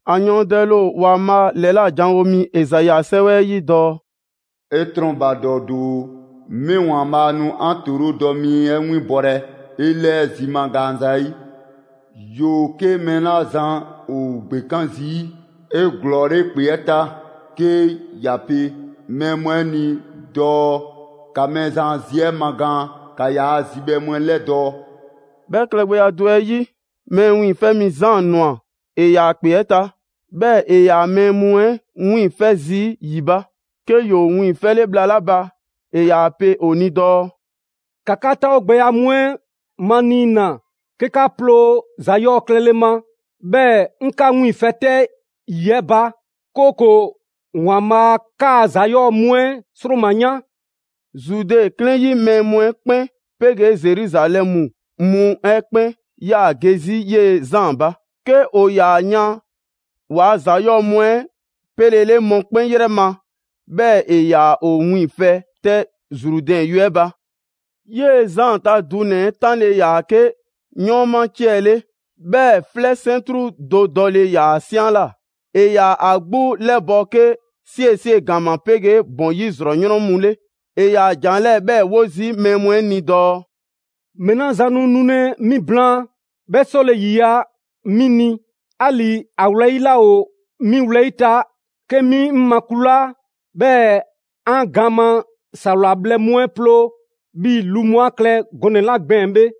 ‑A yɔɔndɛle ‑o ‑Waanbhaa' ‑lɛla' janwo mi Ezai a 'sɛwɛ 'ɛ 'yi dɔɔ: «'E 'trɔnbadɔ doo, 'mi ‑Waanbhaa' nu 'an ‑toorodɔ mi 'ɛ 'winbɔlɛ 'e 'lɛɛ zi magaan zayi'. ‑Yoo 'ke mɛɛ 'la zan ‑o ‑gbekan zii' 'eglɔɔle ‑kpe 'ɛ ta 'ke ‑ya pe mɛɛ mu 'ɛ ni dɔɔ. ‑Ka Mɛɛzan a zi 'ɛ magaan, ‑ka ‑yaa' zibhɛ mu 'ɛ 'lɛdɔɔ‑!» 'Bhɛ klɛgbɛya do 'ɛ 'yi, Mɛɛ Wiiŋfɛ' Mi Zaan ꞊nwa, ‑e ‑yaa ‑kpe 'ɛ ta, 'bhɛɛ‑ ‑e ‑yaa mɛɛ mu 'ɛ wiiŋfɛ' zii' ‑yi ba. 'Ke ‑yoo wiiŋfɛle bhla 'la ba, ‑e ‑yaa pe ‑o ni dɔɔ: «‑Ka 'ka 'taawogbɛya mu 'ɛ maniina 'ke 'ka 'ploo ‑za 'yɔɔ‑ klɛle ma; 'bhɛɛ‑ 'ŋ 'ka 'wiiŋfɛ‑ 'tɛ ‑yi 'ɛ ba; 'kooko‑ ‑Waanbhaa' 'kaa‑ ‑za 'yɔɔ‑ mu 'ɛ 'sroma‑ yan!» Zude 'klɛɛn 'ɛ 'yi mɛɛ mu 'ɛ 'kpɛn 'pegee Zeruzalɛmu mu 'ɛ 'kpɛn 'yaa‑ ge 'zi 'yee‑ Zaan ba. 'Ke ‑o ‑yaa yan ‑waa' ‑za 'yɔɔ‑ mu 'ɛ 'pelele mɔkpɛn' 'yrɛ ma, 'bhɛɛ‑ ‑e ‑yaa ‑o wiiŋfɛ 'tɛ Zrudɛn yue 'ɛ ba. 'Yee‑ Zaan ta dunɛ‑ 'ɛ 'tanle‑ ‑yaa 'ke 'yɔɔnma 'ciɛ‑ 'le, 'bhɛɛ‑ 'flɛ 'sɛntru do dɔle ‑yaa ‑a 'saanla. ‑E ‑yaa ‑a 'gbu 'lɛbɔ‑ 'ke 'siesie‑ ‑gama 'pegee ‑bɔn 'yi ‑zrɔ 'yrɔn mu 'le. ‑E ‑yaa ‑jan 'lɛɛ‑ 'bhɛɛ‑ 'wo zii' mɛɛ mu 'ɛ ni dɔɔ: «Mɛɛ 'la zan nu nulɛ 'mi blaan, 'bhɛ 'sɔle‑ ‑yiya' 'mi ni, 'ali‑ ‑a wlɛyi' laa ‑o 'mi wlɛyi' ta 'ke 'mi 'ŋ makulaa 'bhɛɛ‑ 'an gaan ma ‑sawla bhlɛ mu 'ɛ ploo, 'bhii‑ lu mu 'a klɛ gɔnɛ‑ 'la gbɛɛn‑ bhe.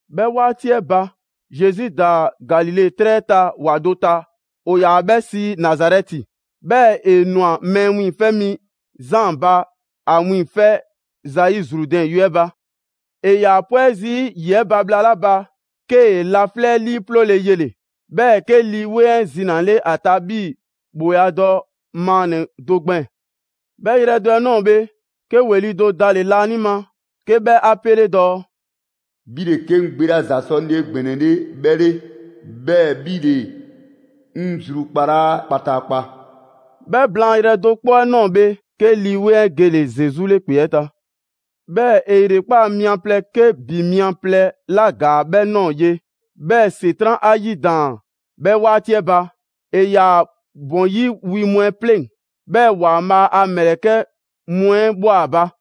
'Bhɛ 'waati 'ɛ ba, Zesu ‑daa Galile 'trɛ ta ‑wa do ta, ‑o ‑yaa 'bhɛ sii Nazarɛti, 'bhɛɛ‑ ‑e ꞊nwa Mɛɛ Wiiŋfɛ' Mi Zaan ba ‑a wiiŋfɛ' zayi' Zrudɛn yue 'ɛ ba. 'E ‑yaa pwɛ zii' ‑yi 'ɛ ba bhla 'la ba, 'kee‑ laflɛ' 'liiploole yele‑, 'bhɛɛ‑ 'ke Lii 'Weŋ 'ɛ zinale ‑a ta 'bhii‑ ‑bhooladɔ maannɛ‑ do gbɛɛn‑. 'Bhɛ yrɛ do 'ɛ ꞊nɔɔ bhe, 'ke ‑weli' do dale‑ laanima 'ke 'bhɛ 'a 'pele dɔɔ: «'Bhi ‑le 'ke 'ŋ gbe 'la ‑za sɔ 'ŋ ni 'egbɛnɛle 'bhɛ 'le, 'bhɛɛ‑ 'bhi ‑le 'ŋ zrukpalaa kpataakpa.» 'Bhɛ blaan yrɛ do 'kpɔ 'ɛ ꞊nɔɔ bhe, 'ke Lii 'Weŋ 'ɛ gele‑ Zesu 'le ‑kpe 'ɛ ta. 'Bhɛɛ‑ ‑e ‑yrekpaa' mia plɛ 'ke ‑bi mia plɛ ‑la ‑gaa 'bhɛ ꞊nɔɔ ye, 'bhɛɛ‑ ‑Setran' 'a 'yidaan‑ 'bhɛ 'waati 'ɛ ba. ‑E ‑yaa ‑bɔn 'yi wi mu 'ɛ 'pleŋ‑, 'bhɛɛ‑ ‑Waanbhaa' a ‑mlɛkɛ' mu 'ɛ ꞊bhwa ‑a ba.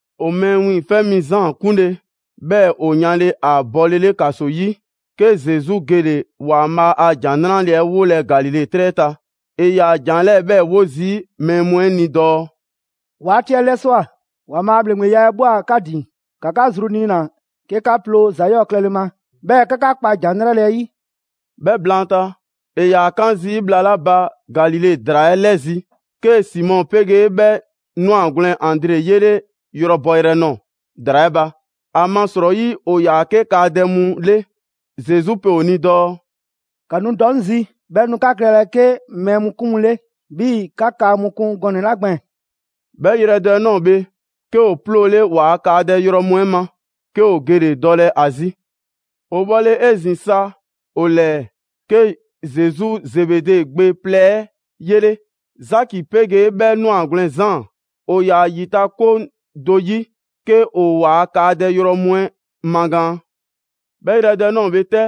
‑O Mɛɛ Wiiŋfɛ' Mi Zaan 'kunle‑, 'bhɛɛ‑ ‑o yanle ‑a bɔlele ‑kaso 'yi, 'ke Zesu gele‑ ‑Waanbhaa' a ‑Jan 'Nrale‑ 'ɛ 'wolɛ‑ Galile 'trɛ 'ɛ ta. ‑E ‑yaa ‑jan 'lɛɛ‑ 'bhɛɛ‑ 'wo zii' mɛɛ mu 'ɛ ni dɔɔ: «'Waati 'ɛ 'lɛswa꞊, ‑Waanbhaa' a ‑bhleŋgbeya 'ɛ ꞊bhwa 'ka ‑din, ‑ka 'ka zru niina‑ 'ke 'ka 'ploo‑ ‑za 'yɔɔ‑ klɛle ma, 'bhɛɛ‑ ‑ka 'ka 'kpa ‑Jan 'Nrale‑ 'ɛ 'yi.» 'Bhɛ blaanta, ‑e ‑yaa 'kan zii' bhla 'la ba Galile ‑draa 'ɛ 'lɛzi‑, 'kee‑ Simɔ 'pegee 'bhɛ 'nwagwlɛn‑ Andre 'yele yrɔ bɔ yrɛ ꞊nɔɔ ‑draa 'ɛ ba; ‑amasrɔyi ‑o ‑yaa 'ke kaadɛ mu 'le. Zesu pe ‑o ni dɔɔ: «‑Ka nu dɔ 'ŋ zi, 'bhɛɛ‑ 'ŋ nu 'ka klɛlɛ 'ke mɛɛ mu 'kun mu 'le 'bhii‑ 'ka kaa mu kun gɔnɛ‑ 'la gbɛɛn‑.» 'Bhɛ yrɛ do 'ɛ ꞊nɔɔ bhe, 'ke ‑o 'ploole ‑waa' kaadɛ yrɔ mu 'ɛ ma, 'ke ‑o gele‑ dɔlɛ ‑a zi. ‑O 'bhɔle‑ 'ezin‑ sa ‑o 'lɛɛ‑, 'ke Zesu Zebede gbe plɛ 'ɛ 'yele‑, Zaki 'pegee 'bhɛ 'nwagwlɛn‑ Zaan. ‑O ‑yaa' ‑yitakoŋ do 'yi 'ke ‑o waa kaadɛ yrɔ mu 'ɛ magaan. 'Bhɛ yrɛ do 'ɛ ꞊nɔɔ bhe 'tɛ,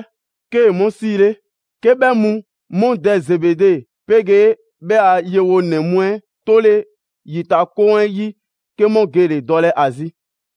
'kee‑ 'mu 'siile. 'Ke 'bhɛ mu 'mu dɛ Zebede 'pegee 'bhɛ a yewonɛ mu 'ɛ 'tole ‑yitakoŋ 'ɛ 'yi, 'ke 'mu gele‑ dɔlɛ ‑a zi.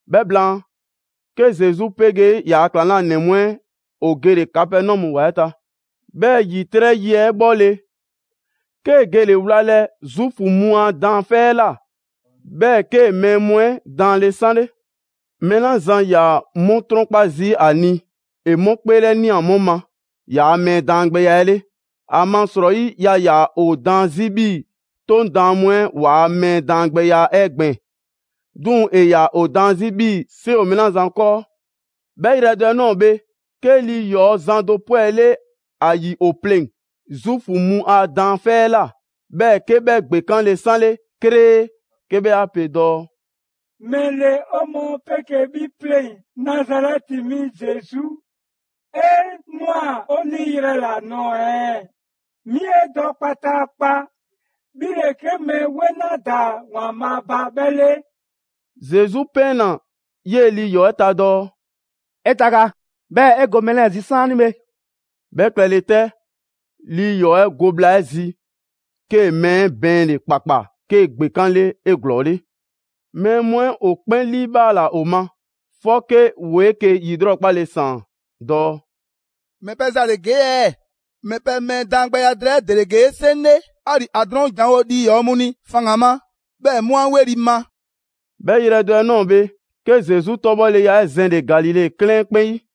'Bhɛ blaan, 'ke Zesu 'pegee ‑yaa' ‑klaŋlanɛ mu 'ɛ ‑o gele‑ Kapɛnɔmu ‑wa 'ɛ ta. 'Bhɛɛ‑ ‑yitrɛ' yi 'ɛ 'bhɔle‑, 'kee‑ gele wlalɛ Zuufu mu a daanfɛ' 'ɛ ꞊la. 'Bhɛɛ‑ 'kee‑ mɛɛ mu 'ɛ daanle 'sanle. Mɛɛ 'la zan ‑yaa 'mu 'trɔnkpa zii' ‑a ni, ‑e 'mu 'kpeelɛnia 'mu ma ‑yaa' mɛɛ daangbɛya 'ɛ 'le. ‑Amasrɔyi yaa ‑yaa ‑o daan 'zi 'bhii‑ 'Toŋ Daan mu 'ɛ ‑waa' mɛɛ daangbɛya 'ɛ gbɛɛn‑, 'duŋ‑ ‑e ‑yaa ‑o daan 'zi 'bhii‑ 'seŋ ‑o mɛɛ 'la zan 'kɔɔ. 'Bhɛ yrɛ do 'ɛ ꞊nɔɔ bhe, 'ke lii ‑yɔɔ' zan do 'pwɛle ‑a ‑yi ‑o pleŋ‑ Zuufu mu a daanfɛ' 'ɛ ꞊la, 'bhɛɛ‑ 'ke 'bhɛ ‑gbekanle 'sanle 'kree 'ke 'bhɛ 'a pe dɔɔ: «‑Mɛle 'o mɔɔ 'pegee 'bhi 'pleŋ‑ Nazarɛti mi Zesu? 'E ꞊nwa 'o 'niyrɛ‑ ‑la nɔɔ‑ ɛɛ? Mi 'e dɔ kpataakpa, 'bhi ‑le 'ke Mɛɛ 'Weŋ 'la ‑daa ‑Waanbhaa' ba 'bhɛ 'le!» Zesu 'pɛɛnna‑ 'yee‑ lii ‑yɔɔ' 'ɛ ta dɔɔ: «'E taga, 'bhɛɛ‑ 'e go mɛɛ 'lɛɛ‑ zi 'saanibhe!» 'Bhɛ klɛle 'tɛ, lii ‑yɔɔ' 'ɛ go bhla 'ɛ zi, 'kee‑ mɛɛ 'ɛ bɛɛnle‑ ‑kpakpa 'kee‑ ‑gbekanle 'eglɔɔle. Mɛɛ mu 'ɛ ‑o 'kpɛn 'liibhaala ‑o ma, 'fɔke ‑woo 'eke‑ ‑lrɔkpale ‑saan dɔɔ: «‑Mɛ pɛ ‑za ‑le ‑gee' ɛɛ? ‑Mɛ pɛ mɛɛ daangbɛya drɛɛ 'ɛ ‑dele ‑gee' 'seŋ 'le! 'Ali‑ ‑a drɔɔn' ‑janwo' lii ‑yɔɔ' mu ni faŋgan‑ ma, 'bhɛɛ 'mu 'a 'weli‑ ma!» 'Bhɛ yrɛ do 'ɛ ꞊nɔɔ bhe, 'ke Zesu 'tɔbhɔleya 'ɛ zɛnle‑ Galile 'klɛɛn 'ɛ 'kpɛn 'yi.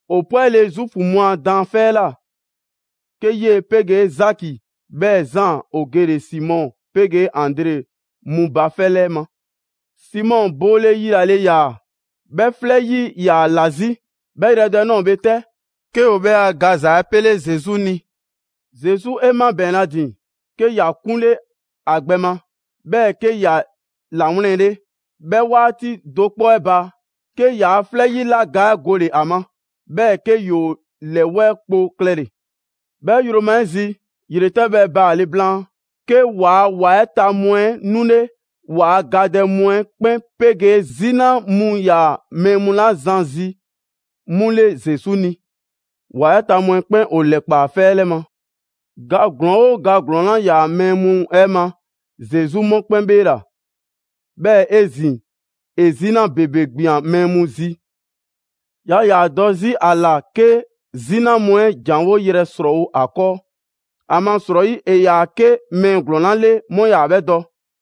‑O 'pwɛle‑ Zuufu mu a daanfɛ' 'ɛ ꞊la, 'ke 'yee‑ 'pegee Zaki 'bhɛɛ‑ Zaan ‑o gele‑ Simɔ 'pegee Andre mu ba 'fɛ 'lɛ ma. Simɔ boole yilale ‑yaa, 'bhɛ 'flɛ 'yi 'yaa‑ ‑la 'zi. 'Bhɛ yrɛ do 'ɛ ꞊nɔɔ bhe 'tɛ, 'ke ‑o 'bhɛ a gaza 'ɛ pele Zesu ni. Zesu 'e 'mabɛɛnle ‑a ‑din, 'ke ‑ya 'kunle ‑a gbɛ ma, 'bhɛɛ‑ 'ke ‑ya 'lawlɛnle. 'Bhɛ 'waati do 'kpɔ 'ɛ ba, 'ke ‑yaa' 'flɛ 'yila ga 'ɛ gole‑ ‑a ma, 'bhɛɛ‑ 'ke ‑yoo ‑lɛwɛɛ' kpo klɛle‑. 'Bhɛ yroma 'ɛ zi, ‑yretɛbhɛ baale' blaan, 'ke ‑waa' ‑wa 'ɛ ta mu 'ɛ 'nule ‑waa' gadɛ mu 'ɛ 'kpɛn 'pegee 'zina mu 'yaa‑ mɛɛ mu 'la zan zi 'mu 'le Zesu ni. ‑Wa 'ɛ ta mu 'ɛ 'kpɛn ‑o ‑lɛkpaa 'fɛ 'ɛ 'lɛ ma. ‑Ga ‑glɔɔn 'oo ga ‑glɔɔn 'la 'yaa‑ mɛɛ mu 'ɛ ma, Zesu 'mu 'kpɛn 'bheela‑. 'Bhɛɛ‑ 'ezin‑, ‑e 'zina ‑bebe ꞊gbian mɛɛ mu zi, yaa ‑yaa dɔ 'zi 'a ‑la 'ke 'zina mu 'ɛ ‑janwo' yrɛ ‑srɔɔwo' ‑a 'kɔɔ, ‑amasrɔyi ‑e ‑yaa 'ke mɛɛ ‑glɔɔn 'la 'le 'mu 'yaa‑ 'bhɛ dɔ.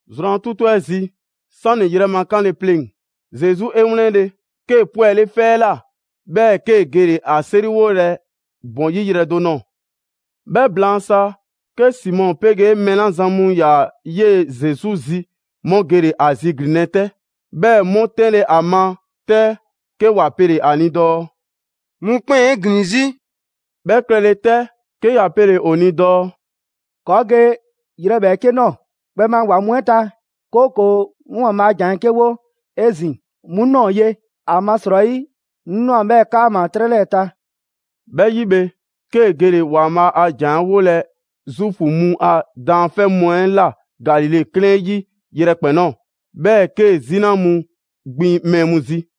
Zrwan 'tutu 'ɛ zi, 'sani‑ yrɛ ma 'kanle‑ pleŋ‑, Zesu 'e 'wlɛnle‑, 'kee‑ 'pwɛle 'fɛ 'ɛ ꞊la, 'bhɛɛ‑ 'kee‑ gele‑ ‑a 'seriwolɛ ‑bɔn 'yi yrɛ do ꞊nɔɔ. 'Bhɛ blaan sa, 'ke Simɔ 'pegee mɛɛ 'la zan mu ‑yaa 'yee‑ Zesu zi, 'mu gele‑ ‑a ziglinlɛ 'tɛ. 'Bhɛɛ‑ 'mu 'tɛnle‑ ‑a ma 'tɛ, 'ke ‑wa pele‑ ‑a ni dɔɔ: «Mɔkpɛn' ‑o 'e ‑glin 'zi.» 'Bhɛ klɛle 'tɛ, 'ke ‑ya pele‑ ‑o ni dɔɔ: «‑Kɔɔ' ge yrɛ ‑bhɛɛke' ꞊nɔɔ, kpɛma ‑wa mu 'ɛ ta, 'kooko‑ 'ŋ ‑Waanbhaa ‑a ‑jan 'ɛ 'ke 'wo 'ezin‑ 'mu ꞊nɔɔ ye. ‑Amasrɔyi 'ŋ ꞊nwa 'bhɛɛ‑ 'kaama‑ 'trɛ 'lɛɛ‑ ta.» 'Bhɛ 'yi bhe, 'kee‑ gele‑ ‑Waanbhaa' a ‑jan 'ɛ 'wolɛ‑ Zuufu mu a daanfɛ' mu 'ɛ ꞊la Galile 'klɛɛn 'yi yrɛkpɛn‑ ꞊nɔɔ, 'bhɛɛ‑ 'kee‑ 'zina mu gbin mɛɛ mu zi.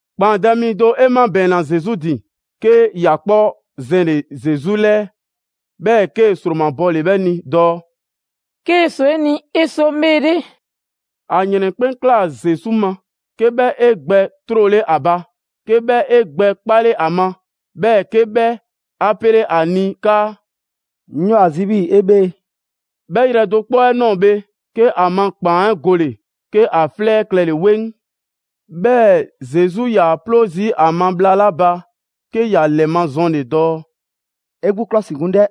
‑Kpaandɛ' mi do 'e 'mabɛɛnna Zesu ‑din, 'ke ‑ya 'kpɔ zɛnle‑ Zesu ‑lɛɛ, 'bhɛɛ‑ 'kee‑ ‑sromabɔle 'bhɛ ni dɔɔ: «'Kee‑ ꞊swa 'e ni, 'e sɔ 'ŋ 'bheele.» ‑A ‑yrɛn 'kpɛn ꞊klaa Zesu ma, 'ke 'bhɛ 'e gbɛ 'trole ‑a ba, 'ke 'bhɛ 'e gbɛ 'kpale ‑a ma, 'bhɛɛ‑ 'ke 'bhɛ 'a pele‑ ‑a ni 'kaa: «'Ŋ ‑yoo ‑a zi 'bhii‑ 'e 'bhee‑.» 'Bhɛ yrɛ do 'kpɔ 'ɛ ꞊nɔɔ bhe, 'ke ‑a ma ‑kpaan 'ɛ gole‑, 'ke ‑a 'flɛ klɛle‑ 'weŋ. 'Bhɛɛ‑ Zesu 'yaa‑ 'ploo zii' 'a ma bhla 'la ba 'ke ‑ya ‑lɛmazɔnle dɔɔ: «'E 'gbu 'klɔsikun 'dɛ,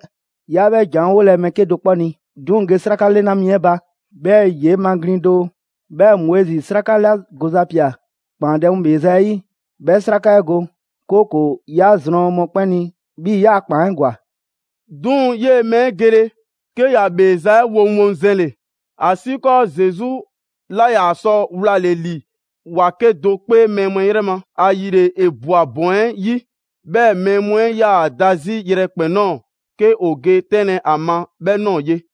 'yaa 'bhɛ ‑jan 'ɛ 'wolɛ‑ mɛɛ 'kedo‑ 'kpɔ ni. 'Duŋ‑ ge 'sraka 'lɛna mi 'ɛ ba, 'bhɛɛ‑ 'yee‑ maglin‑ doo, 'bhɛɛ‑ Moizi 'sraka 'la goza ꞊pia ‑kpaandɛ' mu ‑bheeza' 'ɛ 'yi, 'bhɛ 'sraka 'ɛ go, 'kooko‑ 'ya zrɔn mɔkpɛn' ni 'bhii‑ 'yaa‑ ‑kpaan 'ɛ ‑gwa.» 'Duŋ‑ 'yee‑ mɛɛ 'ɛ gele, 'ke ‑ya ‑bheeza' 'ɛ 'woŋwoŋzɛnle, ‑asiikɔɔ Zesu 'laa ‑yaa sɔ wlale ‑li ‑wa 'kedo‑ 'kpee mɛɛ mu 'ɛ yrɛ ma. ‑Ayile ‑e ꞊bwa ‑bɔn 'ɛ 'yi, 'bhɛɛ‑ mɛɛ mu 'ɛ 'yaa‑ da 'zi yrɛkpɛn‑ ꞊nɔɔ 'ke ‑o ge 'tɛnlɛ‑ a ma 'bhɛ ꞊nɔɔ ye.